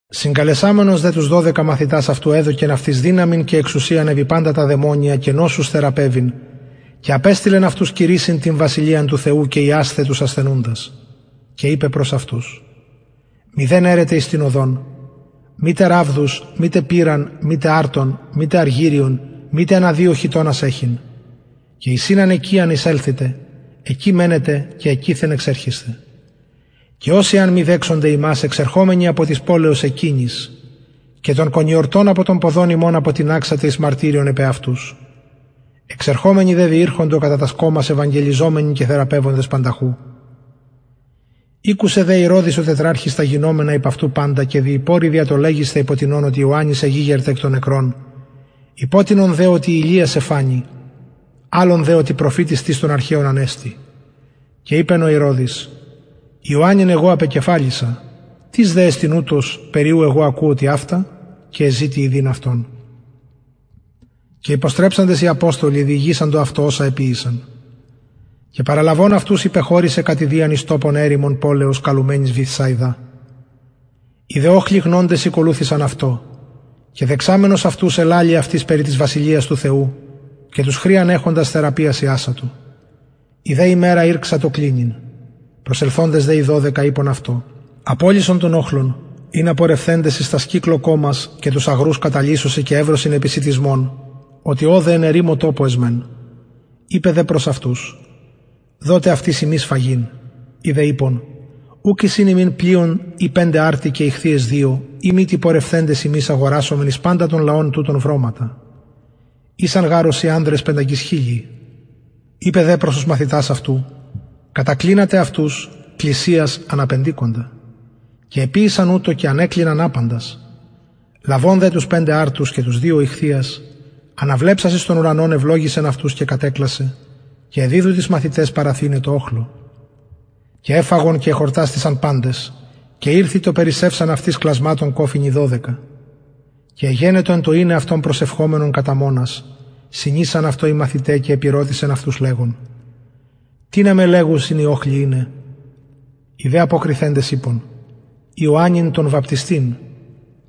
συγκαλεσαμενος δε τους δωδεκα εδωκεν αυτοις δυναμιν και εξουσιαν επι παντα τα δαιμονια και νοσους θεραπευειν και απεστειλεν αυτους κηρυσσειν την βασιλειαν του θεου και ιασθαι τους ασθενουντας και ειπεν προς αυτους μηδεν αιρετε εις την οδον μητε ραβδους μητε πηραν μητε αρτον μητε αργυριον μητε ανα δυο χιτωνας εχειν και εις ην αν οικιαν εισελθητε εκει μενετε και εκειθεν εξερχεσθε και οσοι εαν μη δεξωνται υμας εξερχομενοι απο της πολεως εκεινης και τον κονιορτον απο των ποδων υμων αποτιναξατε εις μαρτυριον επ αυτους εξερχομενοι δε διηρχοντο κατα τας κωμας ευαγγελιζομενοι και θεραπευοντες πανταχου ηκουσεν δε ηρωδης ο τετραρχης τα γινομενα υπ αυτου παντα και διηπορει δια το λεγεσθαι υπο τινων οτι ιωαννης εγηγερται εκ νεκρων υπο τινων δε οτι ηλιας εφανη αλλων δε οτι προφητης εις των αρχαιων ανεστη και ειπεν ηρωδης ιωαννην εγω απεκεφαλισα τις δε εστιν ουτος περι ου εγω ακουω τοιαυτα και εζητει ιδειν αυτον και υποστρεψαντες οι αποστολοι διηγησαντο αυτω οσα εποιησαν και παραλαβων αυτους υπεχωρησεν κατ ιδιαν εις τοπον ερημον πολεως καλουμενης βηθσαιδαν οι δε οχλοι γνοντες ηκολουθησαν αυτω και δεξαμενος αυτους ελαλει αυτοις περι της βασιλειας του θεου και τους χρειαν εχοντας θεραπειας ιατο η δε ημερα ηρξατο κλινειν προσελθοντες δε οι δωδεκα ειπον αυτω απολυσον τον οχλον ινα απελθοντες εις τας κυκλω κωμας και τους αγρους καταλυσωσιν και ευρωσιν επισιτισμον οτι ωδε εν ερημω τοπω εσμεν ειπεν δε προς αυτους δοτε αυτοις υμεις φαγειν οι δε ειπον ουκ εισιν ημιν πλειον η πεντε αρτοι και ιχθυες δυο ει μητι πορευθεντες ημεις αγορασωμεν εις παντα τον λαον τουτον βρωματα ησαν γαρ ωσει ανδρες πεντακισχιλιοι ειπεν δε προς τους μαθητας αυτου κατακλινατε αυτους κλισιας ανα πεντηκοντα και εποιησαν ουτως και ανεκλιναν απαντας λαβων δε τους πεντε αρτους και τους δυο ιχθυας αναβλεψας εις τον ουρανον ευλογησεν αυτους και κατεκλασεν και εδιδου τοις μαθηταις παρατιθεναι τω οχλω και εφαγον και εχορτασθησαν παντες και ηρθη το περισσευσαν αυτοις κλασματων κοφινοι δωδεκα και εγενετο εν τω ειναι αυτον προσευχομενον καταμονας συνησαν αυτω οι μαθηται και επηρωτησεν αυτους λεγων τινα με λεγουσιν οι οχλοι ειναι οι δε αποκριθεντες ειπον ιωαννην τον βαπτιστην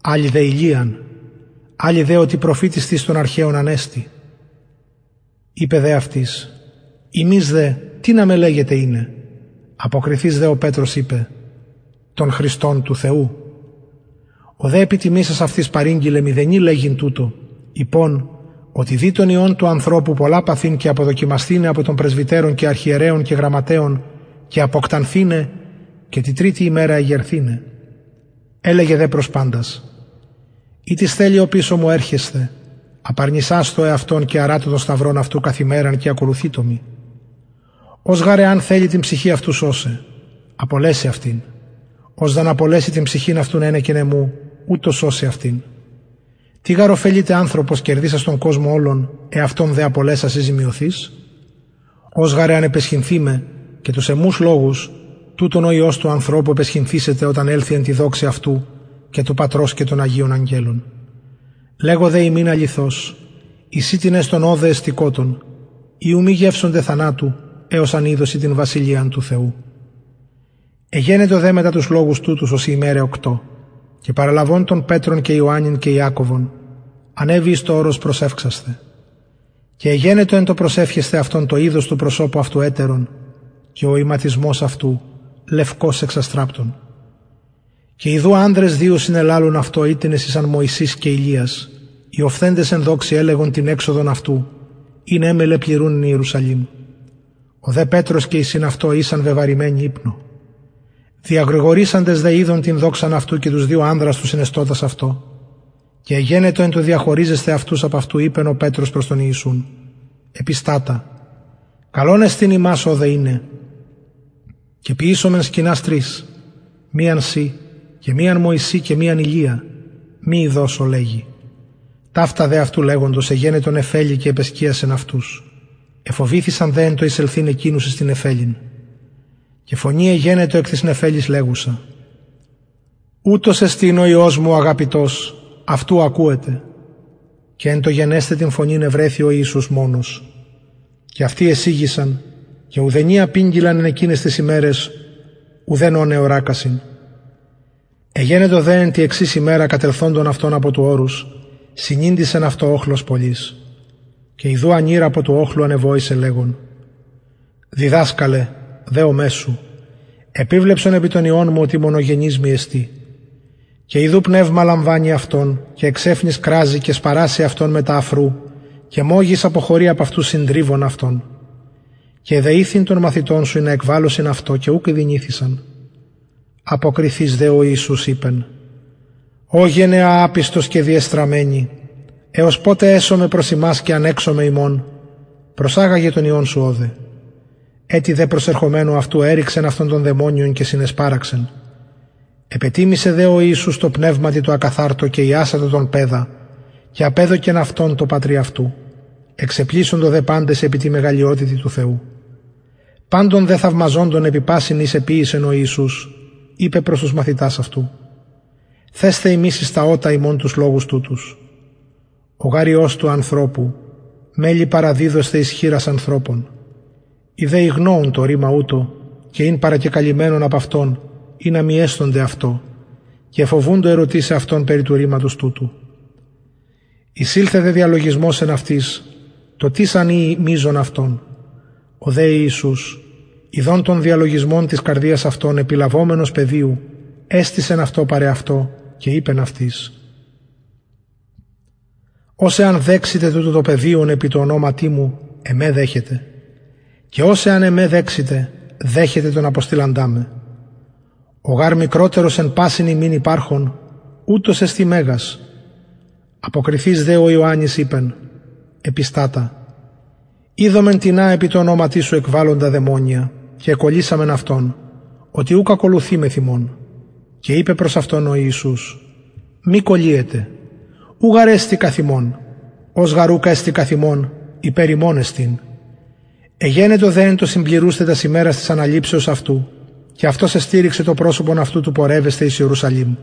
αλλοι δε ηλιαν αλλοι δε οτι προφητης τις των αρχαιων ανεστη ειπεν δε αυτοις υμεις δε τινα με λεγετε ειναι αποκριθεις δε ο πετρος ειπεν τον χριστον του θεου ο δε επιτιμησας αυτοις παρηγγειλεν μηδενι ειπειν τουτο ειπων οτι δει τον υιον του ανθρωπου πολλα παθειν και αποδοκιμασθηναι απο των πρεσβυτερων και αρχιερεων και γραμματεων και αποκτανθηναι και τη τριτη ημερα αναστηναι ελεγεν δε προς παντας ει τις θελει οπισω μου ελθειν απαρνησασθω εαυτον και αρατω τον σταυρον αυτου και ακολουθειτω μοι ος γαρ εαν θελη την ψυχην αυτου σωσαι απολεσει αυτην ος δ αν απολεση την ψυχην αυτου ενεκεν εμου ουτος σωσει αυτην τι γαρ ωφελειται ανθρωπος κερδησας τον κοσμον ολον εαυτον δε απολεσας η ζημιωθεις ος γαρ αν επαισχυνθη με και τους εμους λογους τουτον ο υιος του ανθρωπου επαισχυνθησεται οταν ελθη εν τη δοξη αυτου και του πατρος και των αγιων αγγελων λεγω δε υμιν αληθως εισιν τινες των ωδε εστωτων οι ου μη γευσωνται θανατου εως αν ιδωσιν την βασιλειαν του θεου εγενετο δε μετα τους λογους τουτους ωσει ημεραι οκτω και παραλαβων πετρον και ιωαννην και ιακωβον ανεβη εις το ορος προσευξασθαι και εγενετο εν τω προσευχεσθαι αυτον το ειδος του προσωπου αυτου ετερον και ο ιματισμος αυτου λευκος εξαστραπτων και ιδου ανδρες δυο συνελαλουν αυτω οιτινες ησαν μωσης και ηλιας οι οφθεντες εν δοξη ελεγον την εξοδον αυτου ην εμελλεν πληρουν εν ιερουσαλημ ο δε πετρος και οι συν αυτω ησαν βεβαρημενοι υπνω διαγρηγορησαντες δε ειδον την δοξαν αυτου και τους δυο ανδρας τους συνεστωτας αυτω και εγενετο εν τω διαχωριζεσθαι αυτους απ αυτου ειπεν πετρος προς τον ιησουν επιστατα καλον εστιν ημας ωδε ειναι και ποιησωμεν σκηνας τρεις μιαν σοι και μιαν μωση και μιαν ηλια μη ειδως ο λεγει ταυτα δε αυτου λεγοντος εγενετο νεφελη και επεσκιασεν αυτους εφοβηθησαν δε εν τω εκεινους εισελθειν εις την νεφελην και φωνη εγενετο εκ της νεφελης λεγουσα ουτος εστιν ο υιος μου ο αγαπητος αυτου ακουετε και εν τω γενεσθαι την φωνην ευρεθη ο ιησους μονος και αυτοι εσιγησαν και ουδενι απηγγειλαν εν εκειναις ταις ημεραις ουδεν ων εωρακασιν εγενετο δε εν τη εξης ημερα κατελθοντων αυτων απο του ορους συνηντησεν αυτω οχλος πολυς και ιδου ανηρ απο του οχλου ανεβοησεν λεγων διδασκαλε δεομαι σου επιβλεψαι επι τον υιον μου οτι μονογενης εστιν μοι και ιδου πνευμα λαμβανει αυτον και εξαιφνης κραζει και σπαρασσει αυτον μετα αφρου και μογις αποχωρει απ αυτου συντριβον αυτον και εδεηθην των μαθητων σου ινα εκβαλωσιν αυτο και ουκ ηδυνηθησαν αποκριθεις δε ο ιησους ειπεν ω γενεα απιστος και διεστραμμενη εως ποτε εσομαι προς υμας και ανεξομαι υμων προσαγαγε τον υιον σου ωδε ετι δε προσερχομενου αυτου ερρηξεν αυτον το δαιμονιον και συνεσπαραξεν επετιμησεν δε ο ιησους τω πνευματι τω ακαθαρτω και ιασατο τον παιδα και απεδωκεν αυτον τω πατρι αυτου εξεπλησσοντο δε παντες επι τη μεγαλειοτητι του θεου παντων δε θαυμαζοντων επι πασιν οις εποιησεν ο ιησους ειπεν προς τους μαθητας αυτου θεσθε υμεις εις τα ωτα υμων τους λογους τουτους ο γαρ υιος του ανθρωπου μελλει παραδιδοσθαι εις χειρας ανθρωπων οι δε ηγνοουν το ρημα τουτο και ην παρακεκαλυμμενον απ αυτων ινα μη αισθωνται αυτο και εφοβουντο ερωτησαι αυτον περι του ρηματος τουτου εισηλθεν δε διαλογισμος εν αυτοις το τις αν ειη μειζων αυτων ο δε ιησους ιδων τον διαλογισμον της καρδιας αυτων επιλαβομενος παιδιου εστησεν αυτο παρ εαυτω και ειπεν αυτοις ος εαν δεξηται τουτο το παιδιον επι τω ονοματι μου εμε δεχεται και ος εαν εμε δεξηται δεχεται τον αποστειλαντα με ο γαρ μικροτερος εν πασιν υμιν υπαρχων ουτος εσται μεγας αποκριθεις δε ο ιωαννης ειπεν επιστατα ειδομεν τινα επι τω ονοματι σου εκβαλλοντα δαιμονια και εκωλυσαμεν αυτον οτι ουκ ακολουθει μεθ ημων και ειπεν προς αυτον ο ιησους μη κωλυετε ος γαρ ουκ εστιν καθ ημων υπερ ημων εστιν εγενετο δε εν τω συμπληρουσθαι τας ημερας της αναληψεως αυτου και αυτος το προσωπον αυτου εστηριξεν του πορευεσθαι εις ιερουσαλημ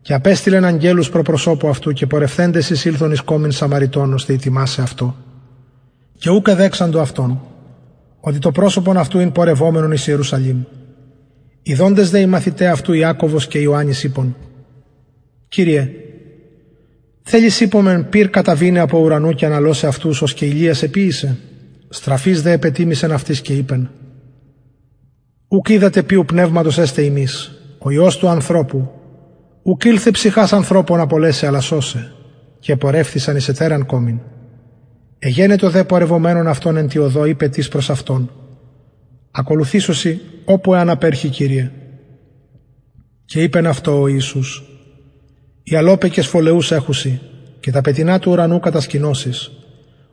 και απεστειλεν αγγελους προ προσωπου αυτου και πορευθεντες εισηλθον εις κωμην σαμαρειτων ωστε ετοιμασαι αυτω και ουκ εδεξαντο αυτον οτι το προσωπον αυτου ην πορευομενον εις ιερουσαλημ ιδοντες δε οι μαθηται αυτου ιακωβος και ιωαννης ειπον κυριε θελεις ειπωμεν πυρ καταβηναι απο του ουρανου και αναλωσαι αυτους ως και ηλιας εποιησεν στραφεις δε επετιμησεν αυτοις και ειπεν ουκ οιδατε οιου πνευματος εστε υμεις ο γαρ υιος του ανθρωπου ουκ ηλθεν ψυχας ανθρωπων απολεσαι αλλα σωσαι και επορευθησαν εις ετεραν κωμην εγενετο δε πορευομενων αυτων εν τη οδω ειπεν τις προς αυτον ακολουθησω σοι οπου αν απερχη κυριε και ειπεν αυτω ο ιησους αι αλωπεκες φωλεους εχουσιν και τα πετεινα του ουρανου κατασκηνωσεις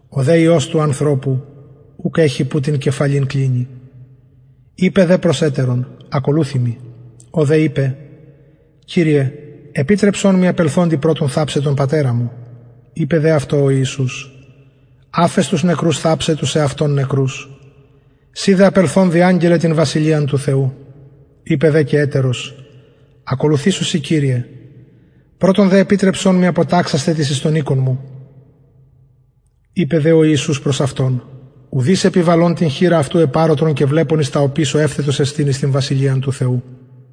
ο δε υιος του ανθρωπου ουκ εχει που την κεφαλην κλινη ειπεν δε προς ετερον ακολουθει μοι ο δε ειπεν κυριε επιτρεψον μοι απελθοντι πρωτον θαψαι τον πατερα μου ειπεν δε αυτω ο ιησους αφες τους νεκρους θαψαι τους εαυτων νεκρους συ δε απελθων διαγγελλε την βασιλειαν του θεου ειπεν δε και ετερος ακολουθησω σοι κυριε πρωτον δε επιτρεψον μοι αποταξασθαι τοις εις τον οικον μου ειπεν δε ο ιησους προς αυτον ουδεις επιβαλων την χειρα αυτου επ αροτρον και βλεπων εις τα οπισω ευθετος εστιν εις την βασιλειαν του θεου